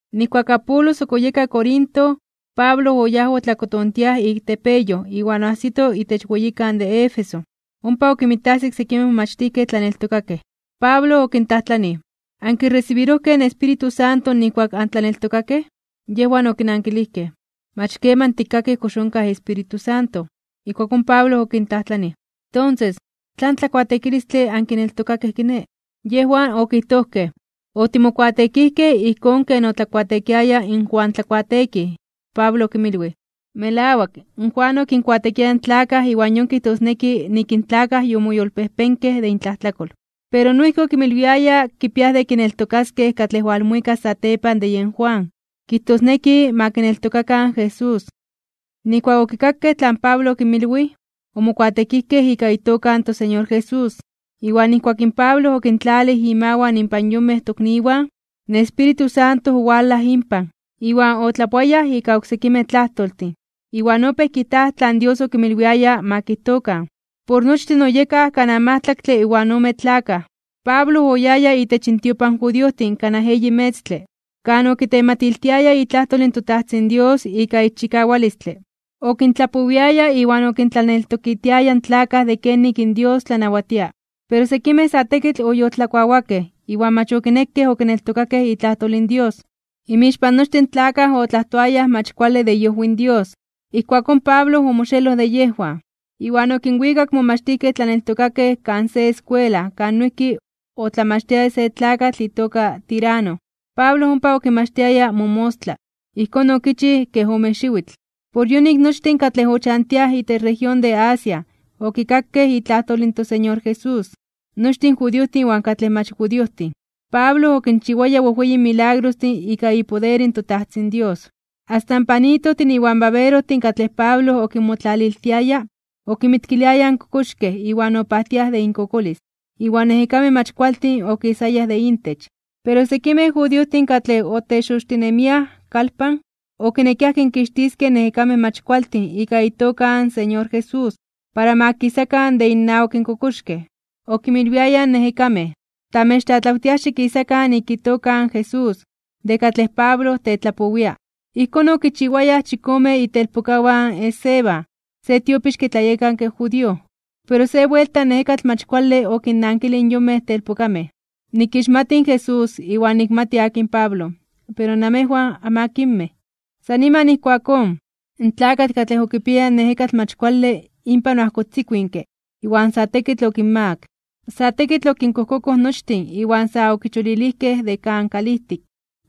Nijkuak Apolos ok oyeka Corinto, Pablo oyáj otlakotontiaj ik tepeyoj iwan oajsito itech weyikan de Éfeso, ompa okinmajsito sekimej momachtijkej tlaneltokakej. Pablo Okintlajtlanij: ―¿Ankiresibirojkej in Espíritu Santo nijkuak antlaneltokakej? Yejwan okinankilijkej: ―Mach keman tikkakij kox onkaj Espíritu Santo. Ijkuakón Pablo okintlajtlanij: ―Tonses, ¿tlan tlakuateekilistle ankineltokakej kiné? Yejwan okijtojkej: ―Otimokuateekijkej ijkón ken otlakuateekiaya in Juan Tlakuateekij. Pablo okinmilwij: ―Melawak, Juan okinkuateekiaya in tlakaj iwan yon kijtosneki nik in tlakaj yomoyolpejpenkej (yomoyolkuepkej) de intlajtlakol. Pero noijki okinmilwiaya kipiaj de kineltokaskej katlej walmuikas satepan de yen Juan, kijtosneki ma kineltokakan in Jesús. Nijkuak okikakej tlan Pablo okinmilwij, omokuateekijkej ika itoka in toSeñor Jesús. Iwan nijkuak in Pablo okintlalij imawan inpan yonmej tokniwan, in Espíritu Santo owalaj inpan, iwan otlapoayaj ika oksekimej tlajtoltin, iwan opéj kijtaj tlan Dios okinmilwiaya ma kijtokan. Por nochtin oyekaj kanaj majtlaktle iwan ome tlakaj. Pablo oyaya itech intiopan in judiojtin kanaj eyi metztle, kan okitematiltiaya itlajtol in toTajtzin Dios ika ixchikawalistle. Okintlapowiaya iwan okintlaneltokitiaya in tlakaj de kenik in Dios tlanawatia. Pero sekimej sa tekitl oyoltlakuawakej iwan mach okinekej okineltokakej itlajtol in Dios. Inmixpan nochtin in tlakaj otlajtoayaj mach kuale de iojwi in Dios. Ijkuakón Pablo omoxeloj de yejwan, iwan okinwikak in momachtijkej tlaneltokakej kan se eskuela kan noijki otlamachtiaya se tlakatl itoka Tirano. Pablo ompa okinmachtiaya momostla. Ijkón okichij kej ome xiwitl. Por yonik nochtin katlej ochantiaj itech región de Asia okikakej itlajtol in toSeñor Jesús, nochtin in judiojtin iwan katlej mach judiojtin. Pablo okinchiwaya wejweyin milagrostin ika ipoder in toTajtzin Dios. Asta in panitojtin iwan baberojtin katlej Pablo okinmotlaliltiaya okinmitkiliayaj in kokoxkej iwan opajtiaj de inkokolis, iwan ejekamej mach kualtin okisayaj de intech. Pero sekimej judiojtin katlej otexoxtinemiaj (otebrujarojtinemiaj) kalpan, okinekiaj kinkixtiskej in ejekamej mach kualtin ika itoka in Señor Jesús para ma kisakan de innawak in kokoxkej. Okinmilwiayaj in ejekamej: ―Tamechnawatiaj xikisakan ika itoka in Jesús, de katlej Pablo tetlapowia. Ijkón okichiwayaj in chikome itelpokawan in Esceva, se tiopixke tlayekanke judío. Pero se buelta in ejekatl mach kuale okinnankilij in yonmej telpokamej: ―Nikixmati in Jesús, iwan nikmati akin in Pablo, pero namejwan, ¿anmakinmej? San niman ijkuakón, in tlakatl katlej okipiaya in ejekatl mach kuale inpan oajkotzikuinke iwan sa tekitl okinmagak (okinmakak). Sa tekitl okinkojkokoj nochtin iwan sa okicholilijkej de kan kalijtik.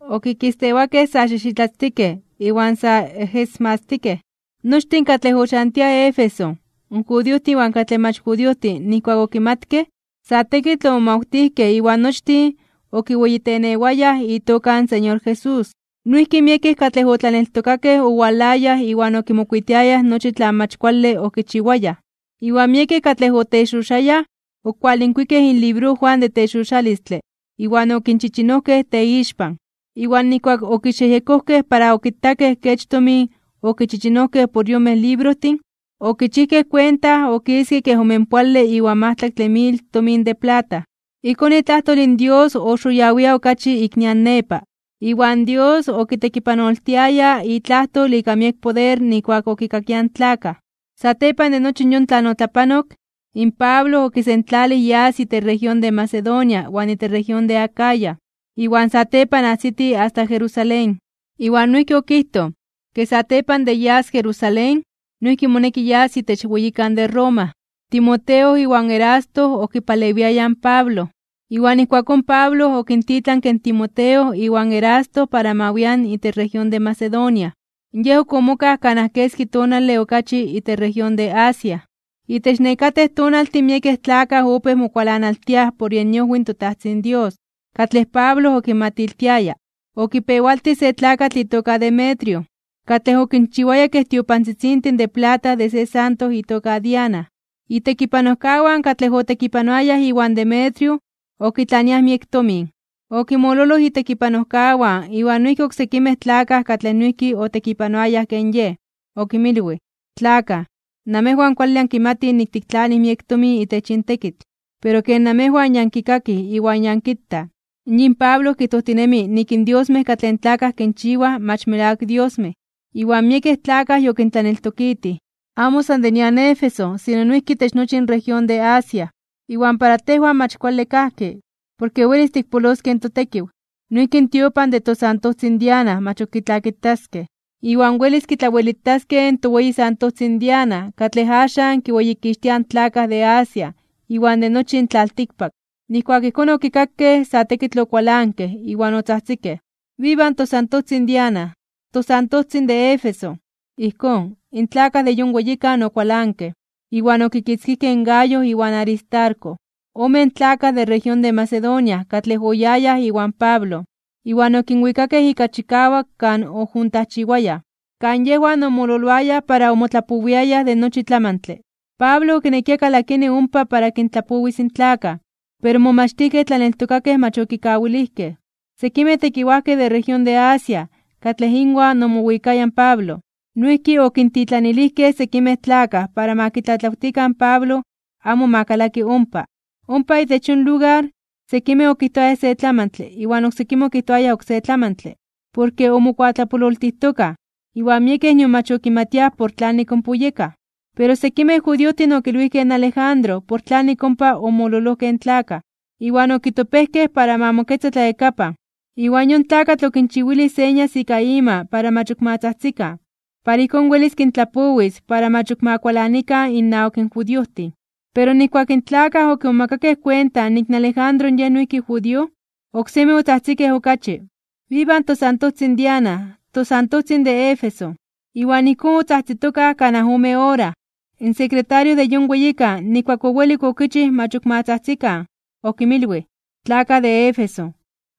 Okikistewakej sa xijxitlatztikej iwan sa ejesmatztikej. Nochtin katlej ochantiaj Éfeso, in judiojtin iwan katlej mach judiojtin nijkuak okimatkej, sa tekitl omomawtijkej iwan nochtin okiweyitenewayaj itoka in Señor Jesús. Noijki miekej katlej otlaneltokakej owalayaj iwan okimokuitiayaj nochi tlan mach kuale okichiwayaj. Iwan miekej katlej otexoxayaj (otlabrujaroayaj) okualinkuikej inlibrojwan de texoxalistle iwan okinchichinojkej teixpan. Iwan nijkuak okixyejyekojkej para okitakej kech tomin okichichinojkej por in yonmej librojtin, okichijkej kuenta okiske kej omenpoale iwan majtlaktle mil tomin de plata. Ijkón itlajtol in Dios oxoyawia (oxitinia) okachi ik nian nepa, iwan Dios okitekipanoltiaya itlajtol ika miek poder nijkuak okikakiaj in tlakaj. Satepan de nochi yon tlan otlapanok, in Pablo okisentlalij yas itech región de Macedonia iwan itech región de Acaya, iwan satepan ajsiti asta Jerusalén. Iwan noijki okijtoj, ke satepan de yas Jerusalén, noijki moneki yas itech weyikan de Roma. Timoteo iwan Erasto okipalewiayaj in Pablo. Iwan ijkuakón Pablo okintitlanke in Timoteo iwan Erasto para ma wian itech región de Macedonia. Yej ok omokaj kanaj keski tonale okachi itech región de Asia. Itech nekatej tonaltin miekej tlakaj opéj mokualanaltiaj por yen iojwi in toTajtzin Dios katlej Pablo okinmatiltiaya. Okipewaltij se tlakatl itoka Demetrio, katlej okinchiwaya kej tiopantzitzintin de plata de se santo itoka Diana. Itekipanojkawan katlej otekipanoayaj iwan Demetrio okitlaniaj miek tomin. Okinmololoj itekipanojkawan iwan noijki oksekimej tlakaj katlej noijki otekipanoayaj ken yej. Okinmilwij: ―Tlakaj, namejwan kuale ankimatij nik tiktlanij miek tomin itech yin tekitl. Pero ken namejwan ya ankikakij iwan ya ankitaj, yin Pablo kijtojtinemi nik in diosmej katlej in tlakaj kinchiwaj mach melawak diosmej, iwan miekej tlakaj yokintlaneltokitij. Amo san de nian Éfeso sino noijki itech nochi in región de Asia. Iwan para tejwan mach kuale kajki, porke welis tikpoloskej in totekiw. Noijki in tiopan de tosantojtzin Diana mach ok kitlakitaskej, iwan welis kitlawelitaskej in toweyi santojtzin Diana katlej axan kiweyikixtiaj in tlakaj de Asia iwan de nochi in tlaltikpak. Nijkuak ijkón okikakej, sa tekitl okualankej iwan otzajtzikej: ―¡Viva tosantojtzin Diana! ¡Tosantojtzin de Éfeso! Ijkón, in tlakaj de yon weyikan okualankej. Iwan okikitzkijkej in Gayo iwan Aristarco, omen tlakaj de región de Macedonia katlej oyayaj iwan Pablo, iwan okinwikakej ika chikawak kan ojuntajchiwayaj, kan yejwan omololoayaj para omotlapowiayaj de nochi tlamantle. Pablo okinekia kalakini ompa para kintlapowis in tlakaj, pero in momachtijkej tlaneltokakej mach okikawilijkej. Sekimej tekiwajkej de región de Asia, katlej inwan omowikaya in Pablo, noijki okintitlanilijkej sekimej tlakaj para ma kitlatlawtikan in Pablo amo ma kalaki ompa. Ompa itech yon lugar, sekimej okijtoayaj se tlamantle iwan oksekimej okijtoayaj oksé tlamantle, porke omokuatlapololtijtokaj, iwan miekej nion mach okimatiaj por tlanik ompa oyekaj. Pero sekimej judiojtin okilwijkej in Alejandro por tlanik ompa omololojkej in tlakaj, iwan okitopejkej para ma moketza tlayakapan. Iwan yon tlakatl okinchiwilij señas ika ima para mach ok ma tzajtzikan. Para ijkón welis kintlapowis para mach ok ma kualanikan innawak in judiojtin. Pero nijkuak in tlakaj okimomakakej kuenta nik in Alejandro yej noijki judío, oksemi otzajtzikej okachi: ―¡Viva tosantojtzin Diana! ¡Tosantojtzin de Éfeso! Iwan ijkón otzajtzitokaj kanaj ome ora. In sekretario de yon weyikan nijkuak owelik okichij mach ok ma tzajtzikan, okinmilwij: ―Tlakaj de Éfeso,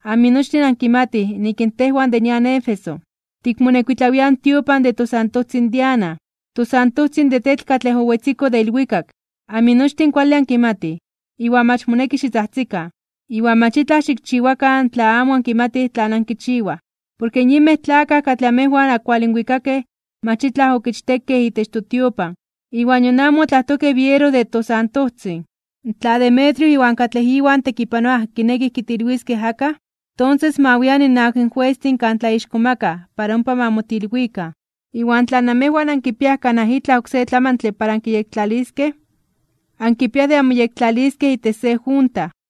aminochtin ankimatij nik in tejwan de nian Éfeso, tikmonekuitlawia in tiopan de tosantojtzin Diana, tosantojtzin de tetl katlej owetziko de ilwikak. Aminochtin kuale ankimatij, iwan mach moneki xitzajtzikan, iwan mach itlaj xikchiwakan tla amo ankimatij tlan ankichiwaj. Porke yinmej tlakaj katlej amejwan ankualinwikakej mach itlaj okichtekej itech totiopan iwan nion amo otlajtojkej biero de tosantojtzin. Tla Demetrio iwan katlej iwan tekipanoaj kinekij kitilwiskej akaj, tonses ma wian innawak juestin kan tlaixkomakaj (tlatzonmanaj) para ompa ma motilwikan. Iwan tla namejwan ankipiaj kanaj itlaj oksé tlamantle para ankiyektlaliskej, ankipiaj de anmoyektlaliskej itech se junta.